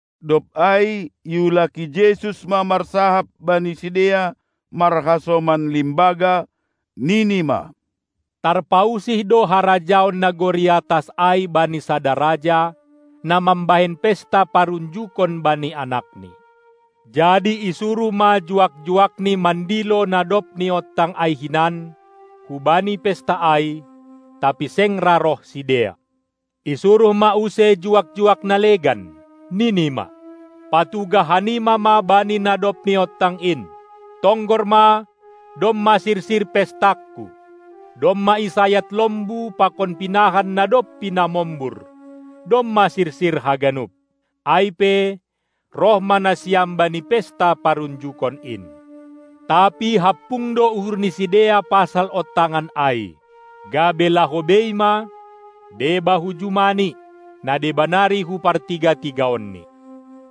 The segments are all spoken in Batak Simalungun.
Dob ai iulaki Jesus ma marsahap bani sidea marhasoman limbaga, nini ma: Tarpausih do harajaon nagori atas ai bani sada raja, na mambahen pesta parunjokon bani anakni. Jadi isuruh ma juak-juakni mandilo na dob niontang ai hinan hubani pesta ai, tapi seng ra roh sidea. Isuruh ma use juak-juak na legan, nini ma: Patugah hanima ma bani na dob niontang in: Tonggor ma, domma sirsir pestangku, domma isayat lombu pakon pinahan na dob pinamombur, domma sirsir haganup! Ai pe roh ma nasiam bani pesta parunjukon in. Tapi hampung do uhur ni sidea pasal ontangan ai, gabe laho bei ma, deba hu jumani, na deba nari hu partiga-tigaonni.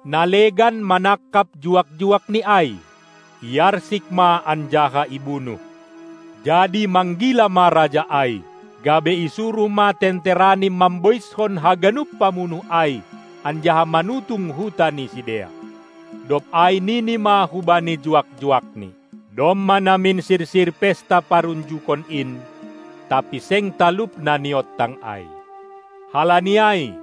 Na legan manangkap juak-juakni ai, iarsik ma anjaha ibunuh. Jadi manggila ma raja ai, gabe isuruh ma tenterani mamboiskon haganup pamunuh ai, anjaha manutung huta ni sidea. Dob ai nini ma hubani juak-juakni: Domma namin sirsir pesta parunjukon in, tapi seng talup na niontang ai. Halani ai,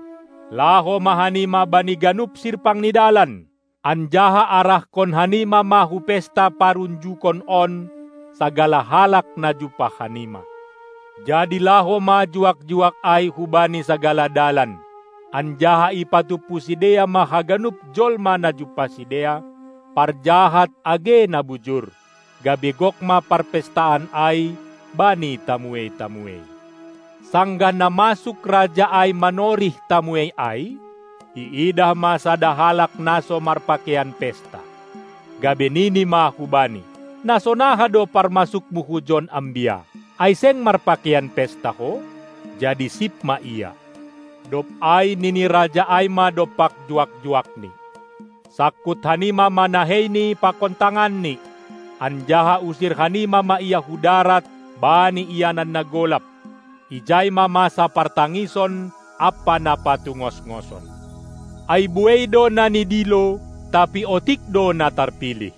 laho ma hanima bani ganup sirpang ni dalan, anjaha arahkon hanima ma hu pesta parunjukon on sagala halak na jumpah hanima. Jadi laho ma juak-juak ai hubani sagala dalan, anjaha ipatumpu sidea ma haganup jolma na jumpah sidea, parjahat age na bujur, gabe gok ma parpestaan ai bani tamuei-tamuei. Sanggah na masuk raja ai manorih tamuei ai, iidah ma sada halak na so marpakeian pesta, gabe nini ma hubani: Na sonaha do parmasukmu hujon ambia, ai seng marpakeian pesta ho? jadi sip ma ia. Dob ai nini raja ai ma dompak juak-juakni: Sangkut hanima ma naheini pakon tanganni, anjaha usir hanima ma ia hu darat bani ianan na golap; ijai ma masa partangison ampa na patungosngoson. Ai buei do na nidilo, tapi otik do na tarpilih.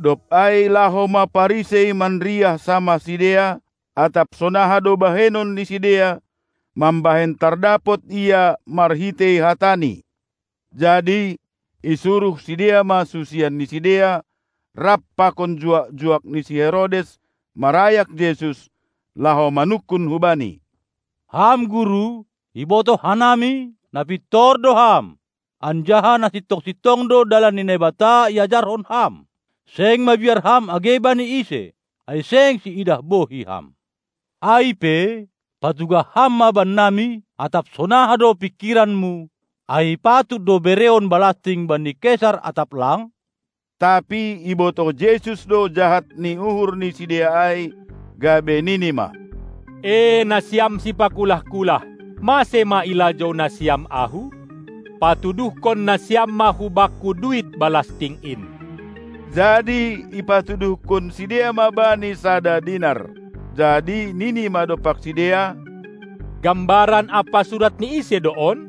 Dob ai laho ma Parisei manriah samah sidea, atap sonaha do bahenon ni sidea mambahen tardapot Ia marhitei hataNi. Jadi isuruh sidea ma susian ni sidea rap pakon juak-juak ni si Herodes marayak Jesus, laho manungkun hu-Bani: Ham Guru, ibotoh hanami, na pintor do Ham, anjaha sintong-sintong do dalan ni Naibata iajarhon Ham; seng mabiar Ham age bani ise, ai seng siidah bohi Ham! Ai pe, patugah Ham ma bennami atap sonaha do pingkiranMu: Ai patut do bereon balasting bani Kesar atap lang? Tapi ibotoh Jesus do jahat ni uhur ni sidea ai, gabe nini ma: E nasiam sipakulah-kulah! Mase ma ilajou nasiam Ahu? Patuduhkon nasiam ma hu Bakku duit balasting in! Jadi ipatuduhkon sidea ma Bani sada dinar. Jadi nini ma dompak sidea: Gambaran ampa surat ni ise do on?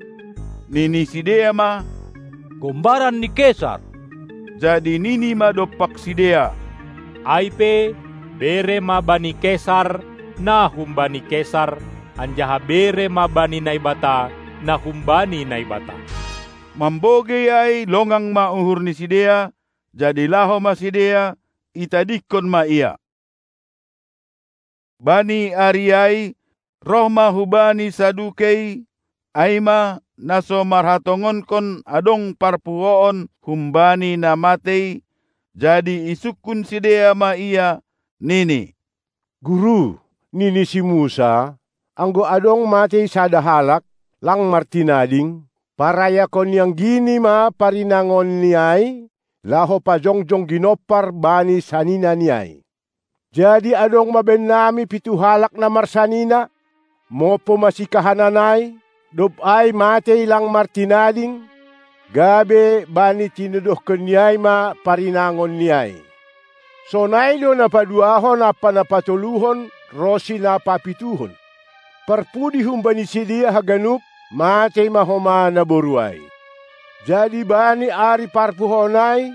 Nini sidea ma: Gombaran ni Kesar! Jadi nini ma dompak sidea: Ai pe, bere ma bani Kesar, na humbani Kesar, anjaha bere ma bani Naibata, na humbani Naibata! Mambogei ai longang ma uhur ni sidea, jadi laho ma sidea, itadingkon ma Ia. Bani ari ai, roh ma hu-Bani Sadukei, ai ma, na so marhatongonkon adong parpuhoon humbani na matei, jadi isungkun sidea ma Ia, nini: Guru, nini si Musa: Anggo adong matei sada halak, lang martinading, parayakon ni anggini ma parinangonni ai, laho pajongjong ginompar bani saninani ai. Jadi adong ma bannami pitu halak na marsanina; mompo ma sikahanan ai, dob ai matei lang martinading, gabe bani tinodohkonni ai ma parinangon ni ai. Sonai do na paduahon ampa na patoluhon ronsi na papituhon. Parpudi humbani sidea haganup matei ma homa naboru ai. Jadi bani ari parpuhoon ai,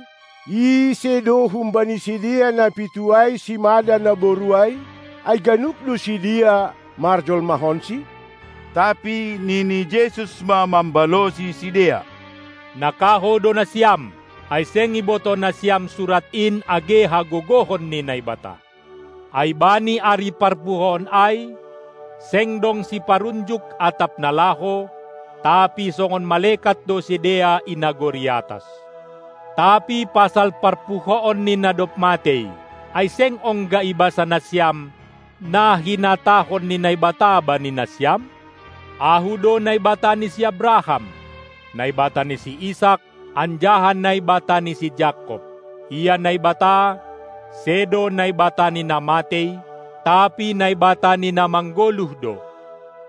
ise do humbani sidea na pitu ai simada naboru ai, ai ganup do sidea marjolmahonsi? Tapi nini Jesus ma mambalosi sidea: Na kahou do nasiam, ai seng ibotoh nasiam Surat in age hagogohon ni Naibata! Ai bani ari parpuhoon ai seng dong siparunjuk atap na laho, tapi songon malekat do sidea i nagori atas. Tapi pasal parpuhoon ni na dob matei, ai seng ongga ibasa nasiam, na hinatahon ni Naibata bani nasiam: Ahu do Naibata ni si Abraham, Naibata ni si Isak anjaha Naibata ni si Jakob? Ia Naibata, sedo Naibata ni na matei, tapi Naibata ni na manggoluh do.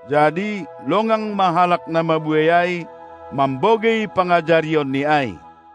Jadi longang ma halak na mabuei ai mambogei pangajarionNi ai.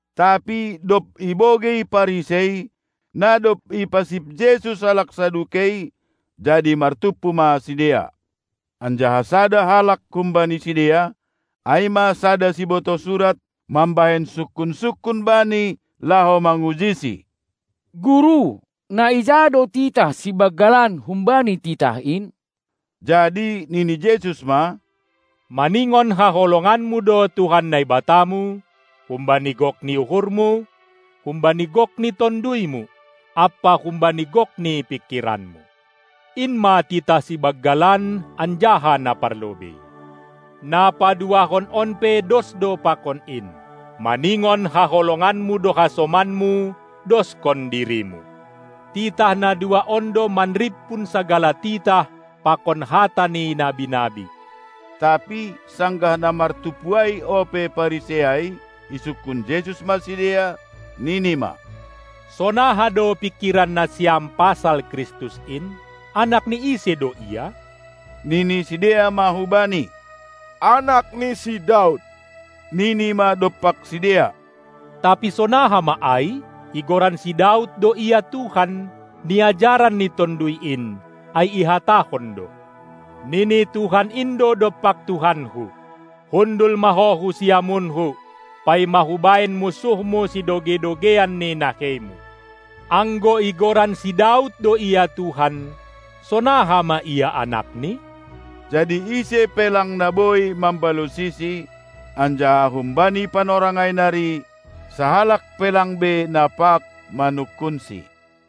Tapi dob ibogei Parisei, na dob ipasip Jesus halak Sadukei, jadi martumpu ma sidea. Anjaha sada halak humbani sidea, ai ma sada sibotoh surat, mambahen sungkun-sungkun Bani laho mangujiSi. Guru, na ija do titah sibanggalan humbani titah in? Jadi nini Jesus ma: Maningon haholonganmu do Tuhan Naibatamu humbani gok ni uhurmu, humbani gok ni tonduymu ampa humbani gok ni pingkiranmu. In ma titah sibanggalan anjaha na parlobei. Na paduahon on pe dos do pakon in: Maningon haholonganmu do hasomanmu doskon dirimu. Titah na dua on do manrimpun sagala titah pakon hata ni nabi-nabi. Tapi sanggah na martumpu ai ope Parisei ai, isungkun Jesus ma sidea, nini ma: Sonaha do pingkiran nasiam pasal Kristus in? Anak ni ise do Ia? Nini sidea ma hu Bani: Anak ni si Daud! Nini ma dompak sidea: Tapi sonaha ma ai, igoran si Daud do Ia Tuhan, niajaran ni Tonduy in, ai ihatahon do: Nini Tuhan in do dompak Tuhanku: Hundul ma Ho hu siamunKu, paima Hubahen munsuhMu sidogei-dogeian ni naheiMu! Anggo igoran si Daud do Ia Tuhan, sonaha ma Ia anakni? Jadi ise pe lang na boi mambalosiSi, anjaha humbani panorang ai nari sahalak pe lang be na pag manungkunSi.